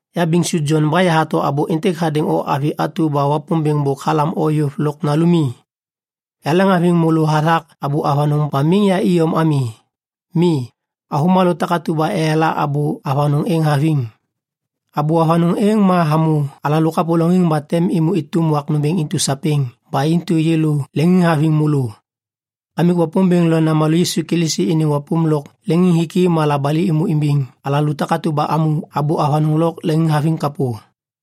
Ya Biŋsu Jon ba yahato abô êntêk hadêŋ o avi atu ba Wapômbêŋ bôk halam yôv lôk nalumi. Yaleŋhaviŋ môlô hathak abô avanôŋ ba miŋ ya iyom ami. Mi, avômalô takatu ba eyala abô avanôŋ êŋ haviŋ. Abô avanôŋ êŋ hamô alalô kapôlôŋiŋ ba tem êmô êtôm wak nômbêŋ intu sapêŋ ba intu yêlô leŋiŋhaviŋ môlô. Kamik Wapômbêŋ lo Namalô Yisu Kilisi iniŋ wapôm lôk leŋiŋhiki ma labali êmô imbiŋ alalô takatu ba amô abô avanôŋ lôk leŋiŋhaviŋ kapô.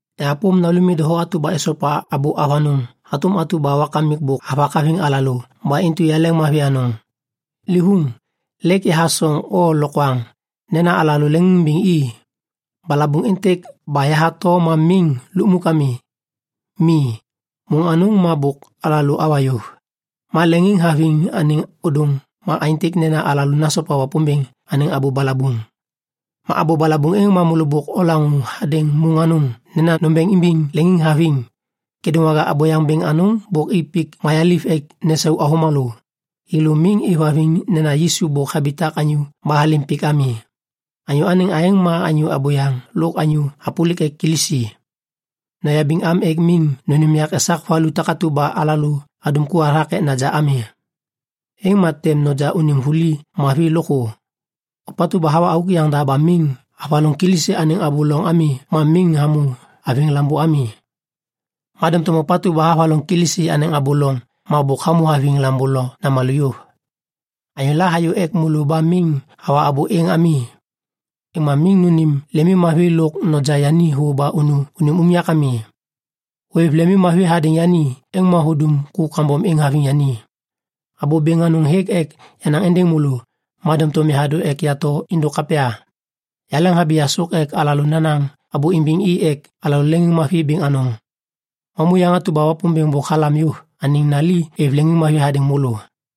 Yahapôm nalumi doho atu ba esopa abô avanôŋ hatôm atu ba Wakamik bôk havak haviŋ alalô ba intu yaleŋmavi anôŋ. Livôŋ, lêk yahathô o lokwaŋ nena alalô leŋiŋimbiŋ i. Balabuŋ êntêk ba yahato ma miŋ lukmuk ami. Mi, môŋ anôŋ ma bôk alalô awa yôv. Ma leŋiŋhaviŋ anêŋ ôdôŋ ma aêntêk nena alalô nasopa Wapômbêŋ anêŋ abô balabuŋ. Ma abô balabuŋ êŋ ma môlô bôk olaŋô hadêŋ môŋ anôŋ nena nombeŋ imbiŋ leŋiŋhaviŋ. Kêdôŋwaga abôyaŋ bêŋ anôŋ bôk i pik mayaliv ek nesau avômalô. Thêlô miŋ êvhaviŋ nena Yisu bôk habitak anyô ba halêm pik ami. Anyô anêŋ aêŋ ma anyô abôyaŋ lôk anyô hapôlik ek Kilisi. Noyabiŋ am ek miŋ nônêm yak esak vuli takatu ba alalô adum ku hathak ek naja ami. Êŋ ma tem noja unim vuli mavi lôkthô. Ôpatu ba hawa auk yaŋda ba miŋ havaloŋ Kilisi anêŋ abô loŋ ami ma miŋ hamô haviŋ Lambô ami. Ma doŋtom ôpatu ba havaloŋ Kilisi anêŋ abô loŋ hamô haviŋ Lambô lo Namalô. Anyôla hayô ek môlô ba miŋ hawa abô êŋ ami, êŋ ma miŋ nônêm lemimmavi lôk noja yani thô ba unu unim unyak ami. Hôêv lemmavi hadêŋ yani, êŋ ma hudum ku kambom êŋ haviŋ yani. Abô bêŋ anôŋ hêk ek yanaŋ êndêŋ môlô, ma doŋtom yahadô ek yato êndôk kapya. Yaleŋhabi yasôk ek alalô nanaŋ abô imbiŋ i ek alalô leŋiŋmavi bêŋ anôŋ. Mamuyaŋ atu ba Wapômbêŋ bôk halam yôv anêŋ nali êv leŋiŋmavi hadêŋ môlô.